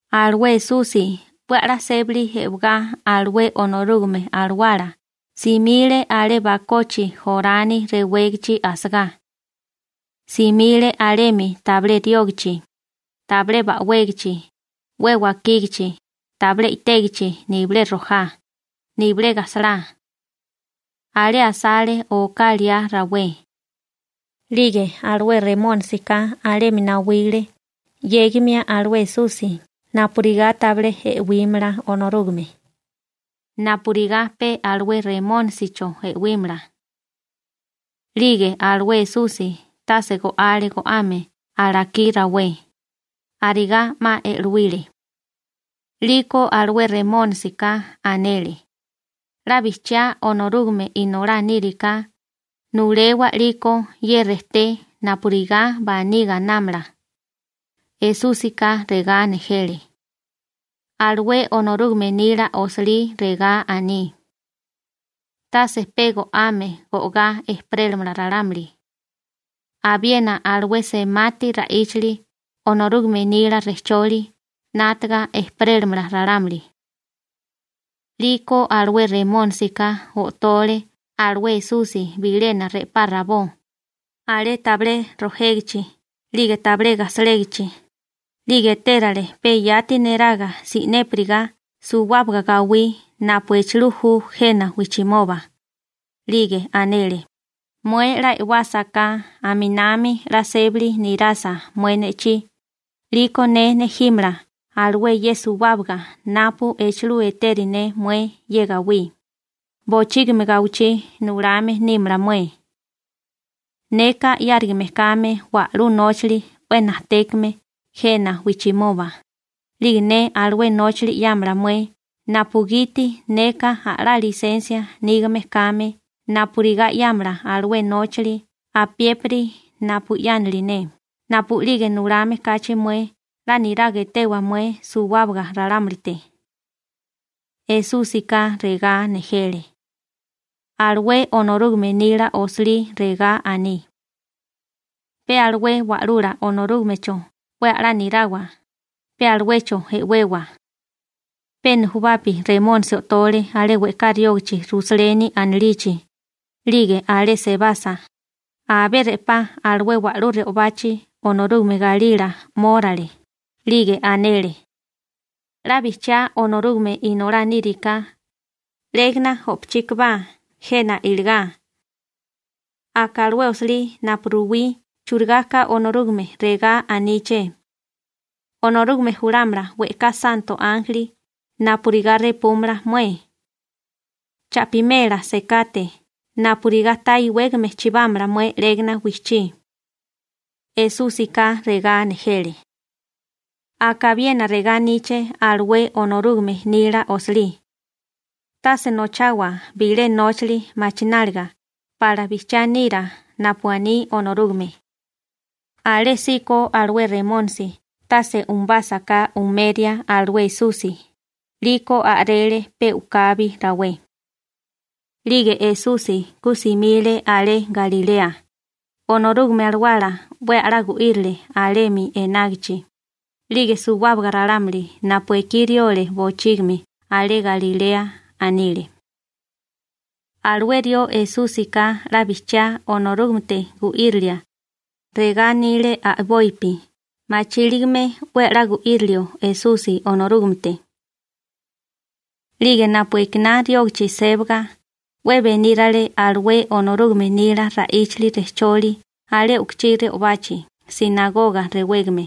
Alué Esusi 'we a'lá sébali e'wagá alué Onorúgame Alawala simile alé bakochi Jorani rewégachi asagá. Simile alemi tabilé riógachi, tabilé ba'wégichi, 'we wakígichi, tabilé i'tégichi nibilé rojá, nibilé gajsalá. Alé asale oká liá rawé. 'Lige alué Remónisika alemi nawile 'yégimia alué Esusi napurigá tabilé e'wímala Onorúgame, napurigá pe alué Remónisicho e'wímala. 'Lige alué Esusi tase go'ale go'ame alakí rawé, arigá 'ma e'lowile. 'Liko alué Remónisika anele: ―'La bijchiá Onorúgame Inolá níriká, nulewa 'liko ye rejté napurigá baní gainámala. Esúsika regá nejele: ―Alué Onorúgame nila osilí regá aní: «Tase pe go'ame go'gá ejperélamala ralámuli, abiena alué semati ra'íchali Onorúgame nila rejcholi 'nátaga ejperélamala ralámuli.» 'Liko alué Remónisika o'tole alué Esusi bilena re'pá rabó, alé tabilé rojégichi 'lige tabilé gasalégichi, 'lige etérele pe yati neraga si'népiriga suwábaga gawí napu echilú ju jena wijchimoba. 'Lige anele: ―Mué 'la e'wásaká, aminami 'la sébali nirasa mué ne'chí, 'liko ne nejímala alué ye suwábaga napu echulú eteri ne mué ye gawí, bochígimi gawichí nulame nímala mué. Neka 'yárigame kame wa'lú nóchali 'we najtékame jena wijchimoba, 'lige ne alué nóchali 'yámala mué napugiti neka a'lá lisensia nígame kame napurigá 'yámala alué nóchali apiépiri napu 'yánili ne, napu'lige nulame kachi mué 'la niraga etewa mué suwábaga ralámulite. Esúsika regá nejele: ―Alué Onorúgame nila osilí regá aní: «Pe alué Wa'lula Onorúgamecho 'we a'lá nirawa, pe aluecho e'wewa.» Pe nujubapi Remónisi o'tole alé we'ká riógachi Rusaleni anilichi, 'lige alé sebasa, abé re'pá alué wa'lú re'obachi Onorúgame galila 'mórale, 'lige anele: ―'La bijchiá Onorúgame Inolá níriká, 'légana o'pochíkabá jena iligá. Aka alué osilí napu ruwí churigá ka Onorúgame regá aníché: Onorúgame julámala we'ká santo ánjeli napurigá repúmala mué. Cha'pimela sekate napurigá ta iwégame chibámala mué 'légana wijchí. Esúsika regá nejele: ―Aka abiena regá aníché alué Onorúgame nila osilí: «Tase nochawa bilé nóchali machináliga pala bijchiá nira napu aní Onorúgame.» Alésíko alué Remónisi tase umubásaká umeria alué Esusi, 'liko a'rele pe u'kabi rawé. 'Lige Esusi ku simile alé Galilea, Onorúgame Alawala 'we a'lá gu'írile alemi enágichi, 'lige suwábaga ralámuli napu ekí riole bochígimi alé Galilea anile: ―Alué rió Esúsika 'la bijchiá Onorúgamete gu'írilia ―regá anile a'bopi machíligame 'we a'lá gu'írilio Esusi Onorúgamete. 'Lige napu ekiná riógachi sébaga 'we benírale alué Onorúgame nila ra'íchali rejcholi alé u'kuchí re'obachi «sinagoga» rewégame.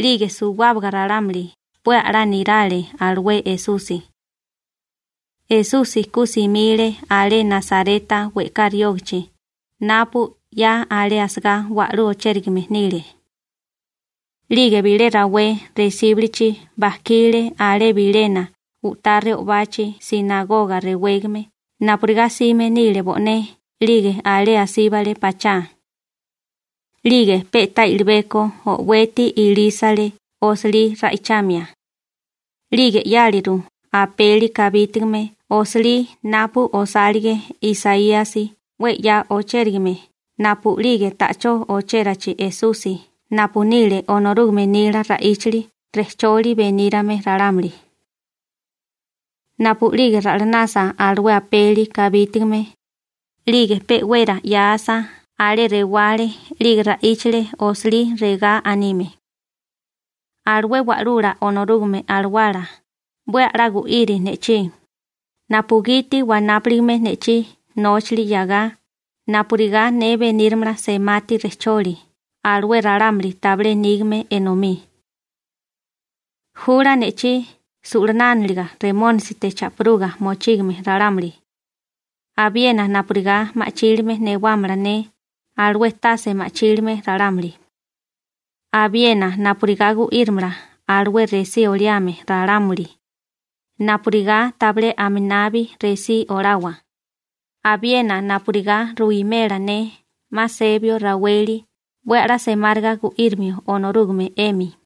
'Lige suwábaga ralámuli 'we a'lá nirale alué Esusi. Esusi ku simile alé Nasareta we'ká riógachi napu 'ya alé asagá wa'lú ochérigame nile. 'Lige bilé rawé resíbulichi bajkile alé bilena u'tá re'obachi «sinagoga» rewégame napurigá 'sime nile bo'né 'lige alé asíbale pachá. 'Lige pe'tá i'libeko o'weti ilísale osilí ra'ichamia. 'Lige 'yáliru apeli kabítigame osilí napu osálige Isaíasi 'we 'ya ochérigame napu'lige ta'chó ochérachi Esusi napu nile Onorúgame nila ra'íchali rejcholi benírame ralámuli. Napu'lige ra'lanasa alué apeli kabítigame, 'lige pe'wera 'yáasa alé rewale 'lige ra'íchale osilí regá anime: Alué Wa'lula Onorúgame Alawala 'we a'lá gu'iri ne'chí, napugiti wanápuligame ne'chí nóchali 'yagá napurigá ne beníramala semati rejcholi alué ralámuli tabilé nígame enomí. Jula ne'chí su'lanánaliga Remónisite cha'piruga mochígame ralámuli, abiena napurigá ma'chílime newámala ne alué tase ma'chílime ralámuli, abiena napurigá gu'írimala alué resí oliame ralámuli napurigá tabilé aminabi resí olawa, abiena napurigá ruwimela ne 'ma sebio raweli 'we a'lá semáriga gu'írimio Onorúgame 'emi.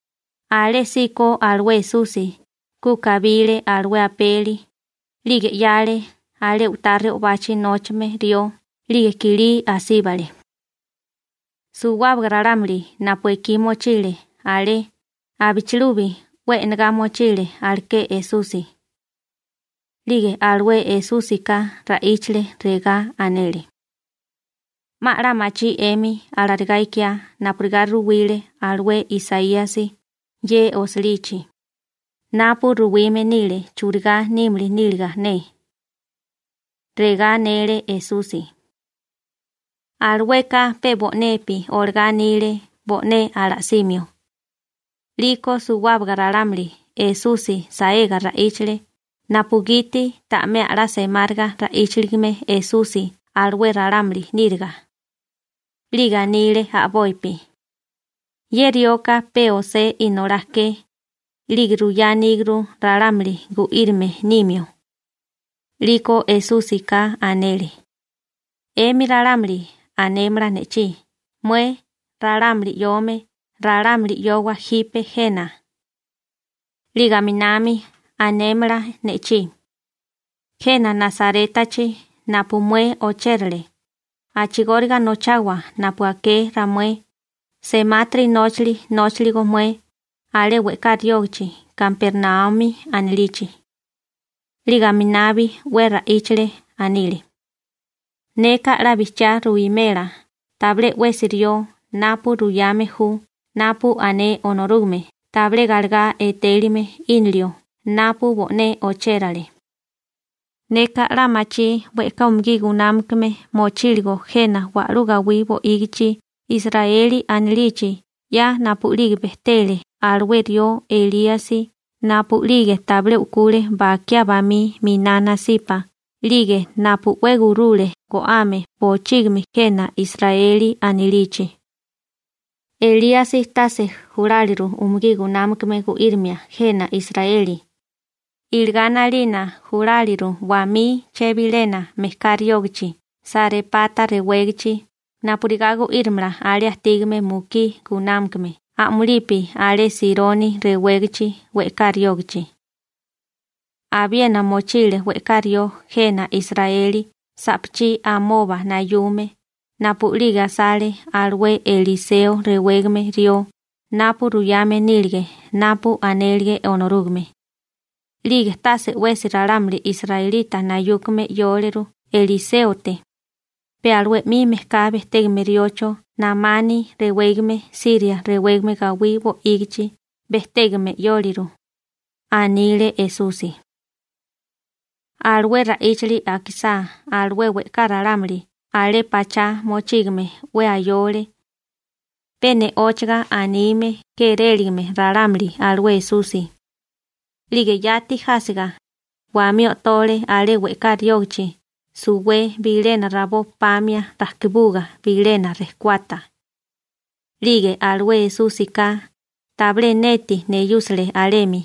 Alésíko alué Esusi ku kabile alué apeli, 'lige 'yale alé u'tá re'obachi nóchame rió 'lige kilí asíbale. Suwábaga ralámuli napu ekí mochile alé abichilubi 'we e'nagá mochile aleké Esusi. 'Lige alué Esúsika ra'íchile, regá anele: ―'Ma 'la machí 'emi alarigá ikiá napurigá ruwile alué Isaíasi ye osilichi, napu ruwime nile churigá nímili níliga ne. Regá anele Esusi. Alueka pe bo'nepi olagá anile bo'né ala'simio. 'Liko suwábaga ralámuli Esusi saega ra'íchale napugiti ta'mé a'lá semáriga ra'íchaligame Esusi alué ralámuli níriga. 'Lige anile a'bopi: ―Ye rioka pe José inolá ke, 'lige ruyá aníguru ralámuli gu'írame nimio. 'Liko Esúsika anele: ―'Emi ralámuli anémala ne'chí: «Mué, ralámuli 'yome, ralámuli 'yowa jipe jena.» 'Lige aminami anémala ne'chí: «Jena Nasarétachi napu mué ochérale, a'chigóriga nochawa napu aké ramué semátiri nóchali nóchaligo mué alé we'ká riógachi Kapernaumi anilichi.» 'Lige aminabi 'we ra'íchale, anile: ―Neka 'la bijchiá ruwimela tabilé 'wesi rió napu ruyame ju napu ané Onorúgame tabilé galegá etélime 'ínilio napu bo'né ochérale. Neka 'la machí we'ká umugí gunámakame mochíligo jena wa'lú gawí bo'ígichi Israeli anilichi 'ya napu'lige bejtele alué rió Elíasi napu'lige tabilé u'kule bakiá bamí miná nasipa 'lige napu 'we gurule go'ame bochígimi jena Israeli anilichi. Elíasi tase juláliru umugí gunámakame gu'írimia jena Israeli, iligá 'nalina juláliru wamí chebilena mejká riógachi Sarépata rewégachi napurigá gu'írimala alé ajtígame mukí gunámakame a'mulipi alé Sironi rewégachi we'ká riógachi. Abiena mochile we'ká rió jena Israeli sa'pachí amoba nayume napu'lige asale alué Eliseo rewégame rió napu ruyame nílige napu anélige Onorúgame, 'lige tase 'wesi ralámuli israelita nayúkame 'yóleru Eliséote, pe alué 'mi mejká bejtégame riocho Namani rewégame Siria rewégame gawí bo'ígichi bejtégame 'yóliru ―anile Esusi. Alué ra'íchali akisá alué we'ká ralámuli alé pachá mochígame 'we ayole, pe ne'óchaga anime kéréligame ralámuli alué Esusi. 'Lige yati jásiga, wamí o'tole alé we'ká riógachi suwé bilena rabó pamia rajkibuga bilena rejkuata. 'Lige alué Esúsika tabilé neti neyúsale alemi,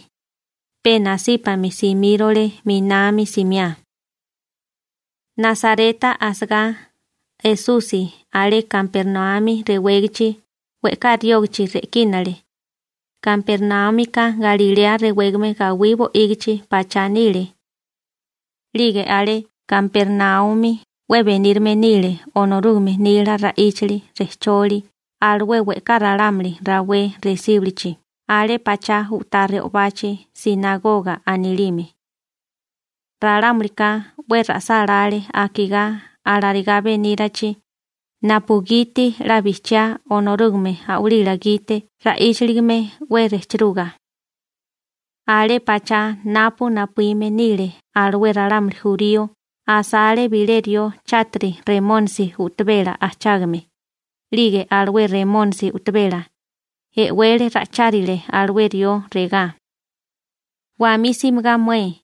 pe nasípami simírole 'minami simiá. Nasareta asagá Esusi alé Kapernaumi rewégachi we'ká riógachi re'kínale. Kapernaúmika Galilea rewégame gawí bo'ígichi pachá nile. 'Lige alé Kapernaumi 'we benírame nile Onorúgame nila ra'íchali rejcholi alué we'ká ralámuli rawé resíbulichi alé pachá u'tá re'obachi «sinagoga» anilime. Ralámulika 'we ra'sálále akigá alarigá benírachi, napugiti 'la bijchiá Onorúgame a'walila gite ra'íchaligame 'we rejchiruga. Alé pachá napu napuíme nile alué ralámuli jurío asale bilé rió chátiri remónisi u'tabela ajchágame, 'lige alué remónisi u'tabela e'wele ra'ichárile alué rió regá: ―¡Wamí simigá mué!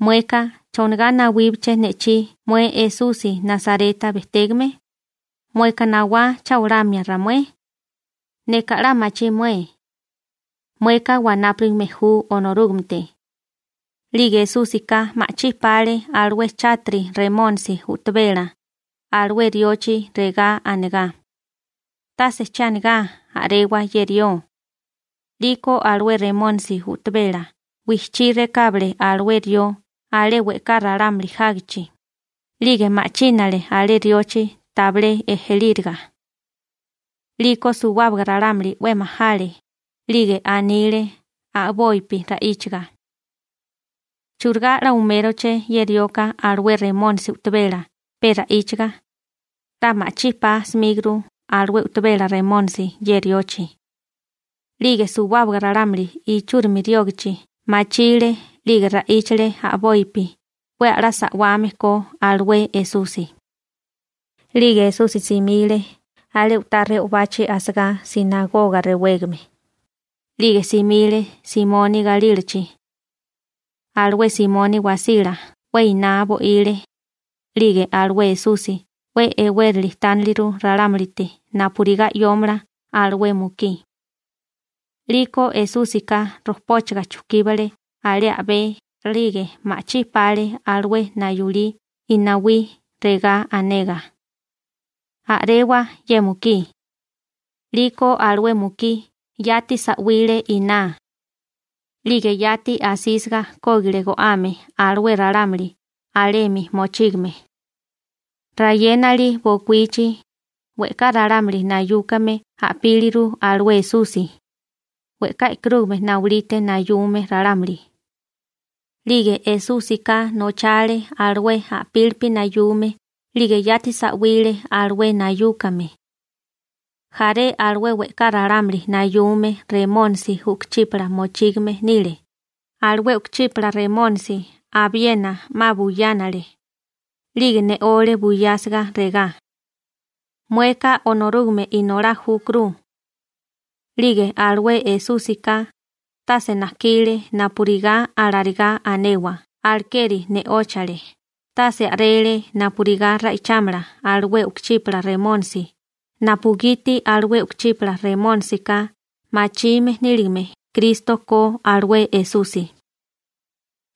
Mueka ¿chonigá nawíbaché ne'chí mué Esusi Nasareta bejtégame? ¿Mueka nawá cha olamia ramué? Neka 'la machí mué: ¡Mueka wanápurigame ju Onorúgamete! 'Lige Esúsika ma'chí pale alué chátiri remónisi u'tabela alué riochi regá anegá: ―¡Tase che anigá, a'rewa ye rió! 'Liko alué remónisi u'tabela wijchí rekábale alué rió alué we'ká ralámuli jágichi, 'lige ma'chínale alé riochi tabilé ejelíriga. 'Liko suwábaga ralámuli 'we majale, 'lige anile a'bopi ra'íchaga: ―¿Churigá 'la uméroché ye rioka alué remónisi u'tabela pe ra'íchaga, 'la ma'chípá 'smíguru alué u'tabela remónisi ye riochi? 'Lige suwábaga ralámuli ichúrimi riógachi machile 'lige ra'íchale a'bopi 'we a'lá sa'wame ko alué Esusi. 'Lige Esusi simile alé u'tá re'obachi asagá «sinagoga» rewégame, 'lige simile Simoni galílachi. Alué Simoni wasila 'we iná bo'ile, 'lige alué Esusi 'we e'wérili tániliru ralámulite napurigá 'yómala alué mukí. 'Liko Esúsika rojpóchaga chujkíbale alé a'bé 'lige ma'chí pale alué nayulí inawí regá anegá: ―¡A'rewa ye mukí! 'Liko alué mukí yati sa'wile iná. 'Lige yati asísiga kógile go'ame alué ralámuli alemi mochígame. Rayénali bokuíchi, we'ká ralámuli nayúkame a'píliru alué Esusi, we'ká e'karúgame nawilite nayume ralámuli. 'Lige Esúsika nochale alué a'pílipi nayume 'lige yati sa'wile alué nayúkame. Jaré alué we'ká ralámuli nayume remónisi u'kuchípala mochígame nile, alué u'kuchípala remónisi abiena 'ma buyánale, 'lige ne'ole buyásiga regá: ―¡Mueka Onorúgame Inolá júkuru! 'Lige alué Esúsika tase najkile napurigá alarigá anewa, alekeri ne'óchale, tase a'rele napurigá ra'ichámala alué u'kuchípala remónisi napugiti alué u'kuchípala remónisika machime níligame Kristo ko alué Esusi.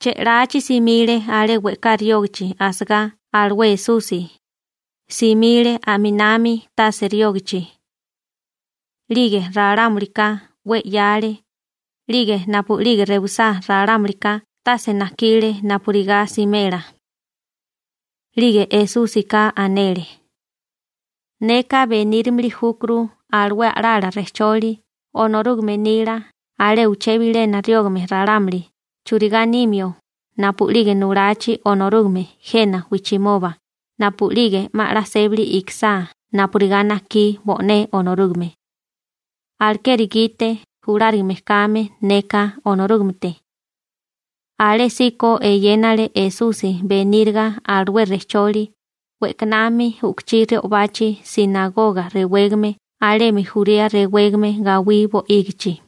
Che'lachi simile alé we'ká riógachi asagá alué Esusi, simile a'minami tase riógachi. 'Lige ralámulika 'we 'yáale, 'lige napu'lige rewisá ralámulika tase najkile napurigá simela. 'Lige Esúsika anele: ―Neka benírimili júkuru alué a'lala rejcholi Onorúgame nila alé uché bilena riógame ralámuli churigá nimio napu'lige nulachi Onorúgame jena wijchimoba napu'lige 'ma 'la sébali ikisá napurigá najkí bo'né Onorúgame. Alekeri gite julárigame kame neka Onorúgamete. Alésíko eyénale Esusi beníriga alué rejcholi we'kanami u'kuchí re'obachi «sinagoga» rewégame alemi Jurea rewégame gawí bo'ígichi.